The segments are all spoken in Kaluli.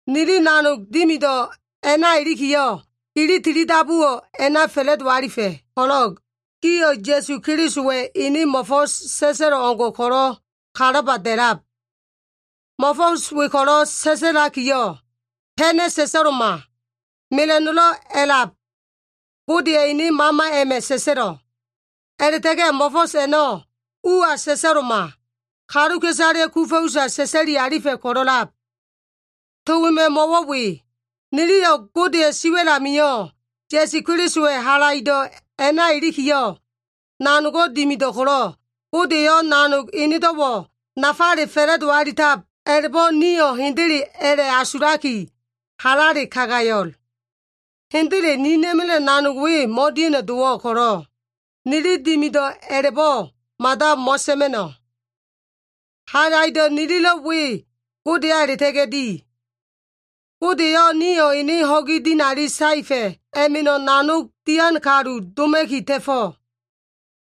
Nili nanog dimido꞉ a꞉na ilikiyo꞉, gili tilidabuwo꞉ a꞉na fa꞉la꞉do alifa꞉ ko꞉lo꞉, gio꞉ Ya꞉su Kelisowa꞉ ene mo꞉fo꞉s sa꞉sa꞉lo꞉ o꞉ngo꞉ ko꞉lo꞉ kalaba da꞉lab. Mo꞉fo꞉s we ko꞉lo꞉ sa꞉sa꞉lakiyo꞉, pena꞉ sa꞉sa꞉lo꞉ma. Mela꞉no꞉lo꞉ a꞉lab Godeya꞉ ene Mama a꞉ma꞉ sa꞉sa꞉lo꞉. A꞉la꞉ta꞉ga꞉ mo꞉fo꞉s a꞉no꞉ uwa sa꞉sa꞉lo꞉ma. Kaluka꞉isaleya꞉ kufa꞉ usa sa꞉sa꞉li alifa꞉ ko꞉lo꞉lab. To wema꞉ mo꞉wo꞉ we. Niliyo꞉ Godeya꞉ siwa꞉l amio꞉, Ya꞉su Kelisowa꞉ halaido꞉ a꞉na ilikiyo꞉, nanogo꞉ dimido꞉ ko꞉lo꞉, Gode eyo꞉ nanog enedo꞉wo꞉ nafale fa꞉la꞉do alitab a꞉la꞉bo꞉ nio꞉ hendele a꞉la꞉asulaki halale kagayo꞉l. Hendele ninina꞉ma꞉la꞉yo꞉ nanog we mo꞉dia꞉no꞉ dowo꞉, ko꞉lo꞉, nili dimido꞉ a꞉la꞉bo꞉ mada mo꞉sa꞉ma꞉no꞉. Halaido꞉ nililo꞉ we Godeya a꞉la꞉ta꞉ga꞉ di. Gode eyo꞉ nio꞉ ene ho꞉gi dinali saefa꞉ a꞉ma꞉ nanog dian kaluka꞉isale doma꞉ki ta꞉fo꞉.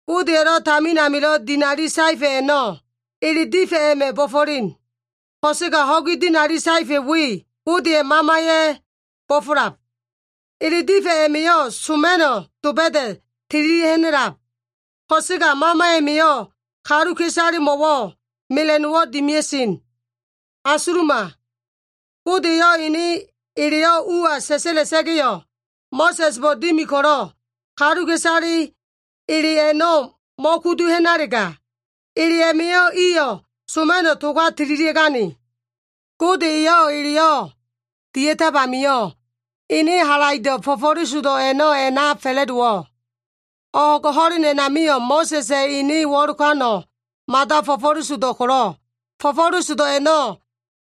Godeya꞉lo꞉ tamin amilo꞉ dinali saefa꞉ a꞉no꞉, ele difa꞉ a꞉ma꞉ bo꞉fo꞉len. Ko꞉sega ho꞉gi dinali saefa꞉ we, Godeya꞉ Mamaya꞉ bo꞉fo꞉lab. Ele difa꞉ a꞉ma꞉yo꞉ soma꞉no꞉ doba꞉da꞉ tililia꞉ ha꞉na꞉lab. Ko꞉sega Mama a꞉ma꞉yo꞉ kaluka꞉isalemo꞉wo꞉ mela꞉no꞉wo꞉ dimia꞉sen. Asuluma. Gode eyo꞉ ene eleyo꞉ uwa sa꞉sa꞉la꞉sa꞉ga꞉yo꞉, Mo꞉sa꞉sbo꞉ dimi ko꞉lo꞉, kaluka꞉isale ele a꞉no꞉ mo꞉kudu ha꞉nalega, ele a꞉ma꞉yo꞉ iyo꞉ soma꞉no꞉ toga tililia꞉gane. Gode eyo꞉ eleyo꞉ dia꞉tab amio꞉, ene halaido꞉ fo꞉fo꞉lesodo꞉ a꞉no꞉ a꞉na fa꞉la꞉dowo꞉. O꞉g ho꞉len a꞉namio꞉ Mo꞉sa꞉sa꞉ ene wo꞉lokano꞉ mada fo꞉fo꞉lesodo꞉ ko꞉lo꞉, fo꞉fo꞉lesodo꞉ a꞉no꞉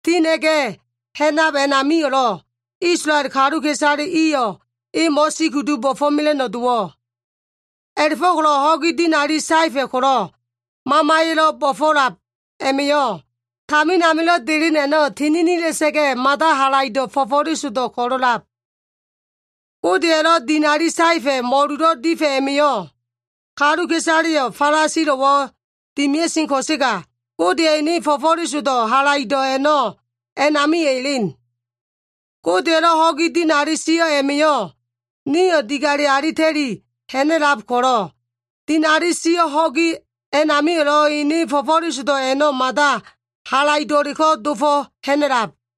tina꞉ga꞉ ha꞉nab a꞉namio꞉lo꞉, Isolael kaluka꞉isale iyo꞉ e mo꞉sikudu bo꞉fo꞉mela꞉no꞉ dowo꞉. A꞉la꞉fo꞉ko꞉lo꞉ ho꞉gi dinali saefa꞉ ko꞉lo꞉ Mamaya꞉lo꞉ bo꞉fo꞉lab a꞉ma꞉yo꞉, tamin amilo꞉ delen a꞉no꞉ tininila꞉sa꞉ga꞉, mada halaido꞉ fo꞉fo꞉lesodo꞉ ko꞉lo꞉lab. Godeya꞉lo꞉ dinali saefa꞉ mo꞉lulo꞉ difa꞉ a꞉ma꞉yo꞉, kaluka꞉isaleyo꞉ falasilo꞉wo꞉ dimia꞉sen ko꞉sega, Godeya꞉ ene fo꞉fo꞉lesodo꞉ halaido꞉ a꞉no꞉ a꞉namio꞉ elen. Godeya꞉lo꞉ ho꞉gi dinali sio꞉ a꞉ma꞉yo꞉, nio꞉ digale alita꞉li ha꞉na꞉lab ko꞉lo꞉, dinali sio꞉ ho꞉gi a꞉namio꞉lo꞉ ene fo꞉fo꞉lesodo꞉ a꞉no꞉ mada halaido꞉leko꞉ dofo꞉ ha꞉na꞉lab.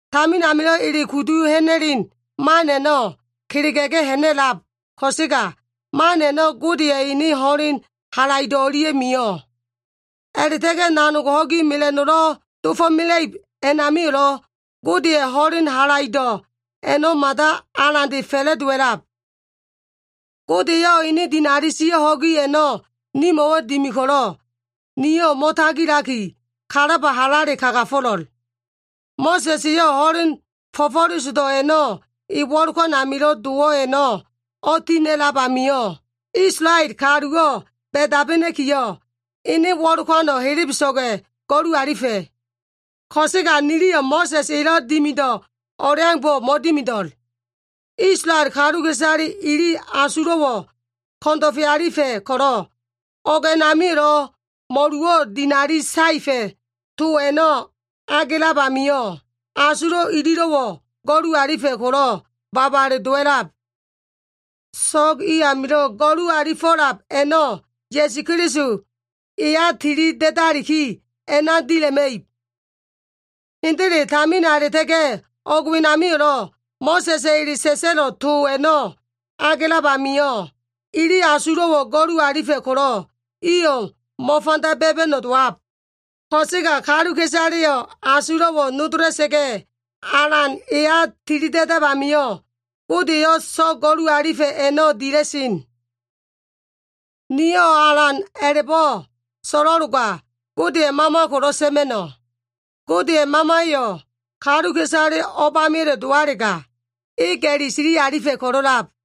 Tamin amilo꞉ ele kudu ha꞉na꞉len man a꞉no꞉ kelega꞉ga꞉ ha꞉na꞉lab ko꞉sega, man a꞉no꞉ Godeya꞉ ene ho꞉len halaido꞉ o꞉lia꞉ mio꞉. A꞉la꞉ta꞉ga꞉ nanog ho꞉gi mela꞉no꞉lo꞉ dofo꞉mela꞉ib a꞉namio꞉lo꞉ Godeya꞉ ho꞉len halaido꞉ a꞉no꞉ mada alande fa꞉la꞉dowa꞉lab. Gode eyo꞉ ene dinali sio꞉ ho꞉gi a꞉no꞉ nimo꞉wo꞉ dimi ko꞉lo꞉, nio꞉ mo꞉tagilaki, kalaba halale kagafo꞉lo꞉l. Mo꞉sa꞉s eyo꞉ ho꞉len fo꞉fo꞉lesodo꞉ a꞉no꞉ e wo꞉lokan amilo꞉ dowo꞉ a꞉no꞉ o꞉tina꞉lab amio꞉, Isolael kaluwo꞉ ba꞉dabena꞉kiyo꞉, ene wo꞉lokano꞉ helebeso꞉ga꞉ go꞉lu alifa꞉. Ko꞉sega niliyo꞉ Mo꞉sa꞉s elo꞉ dimido꞉ o꞉leaumbo꞉ mo꞉dimido꞉l. Isolael kaluka꞉isale ili asulo꞉wo꞉ ko꞉ndo꞉fe alifa꞉ ko꞉lo꞉, o꞉g a꞉namio꞉lo꞉ mo꞉luwo꞉ dinali saefa꞉ to a꞉no꞉ agelab amio꞉, asulo꞉ ililo꞉wo꞉ go꞉lu alifa꞉ ko꞉lo꞉ babale dowa꞉lab. So꞉g i amilo꞉ go꞉lufo꞉lab a꞉no꞉ Ya꞉su Keliso eya tili da꞉daliki a꞉na dila꞉ma꞉ib. Hendele, tamina a꞉la꞉ta꞉ga꞉ o꞉g wenamio꞉lo꞉, Mo꞉sa꞉sa꞉ ele sa꞉sa꞉lo꞉ to a꞉no꞉ agelab amio꞉, ili asulo꞉wo꞉ go꞉lu alifa꞉ ko꞉lo꞉, iyo꞉ mo꞉fanda ba꞉ba꞉no꞉ dowab. Ko꞉sega kaluka꞉isaleyo꞉ asulo꞉wo꞉ nodola꞉sa꞉ga꞉, Alan eya tili da꞉dab amio꞉, Gode eyo꞉ so꞉g go꞉lu alifa꞉ a꞉no꞉ dila꞉sen. Niyo꞉ Alan a꞉la꞉bo꞉ so꞉lo꞉loga, Godeya꞉ Mama ko꞉lo꞉ sa꞉ma꞉no꞉. Godeya꞉ Mamayo꞉ kaluka꞉isale o꞉bameya꞉le dowalega, e ga꞉li sili alifa꞉ ko꞉lo꞉lab.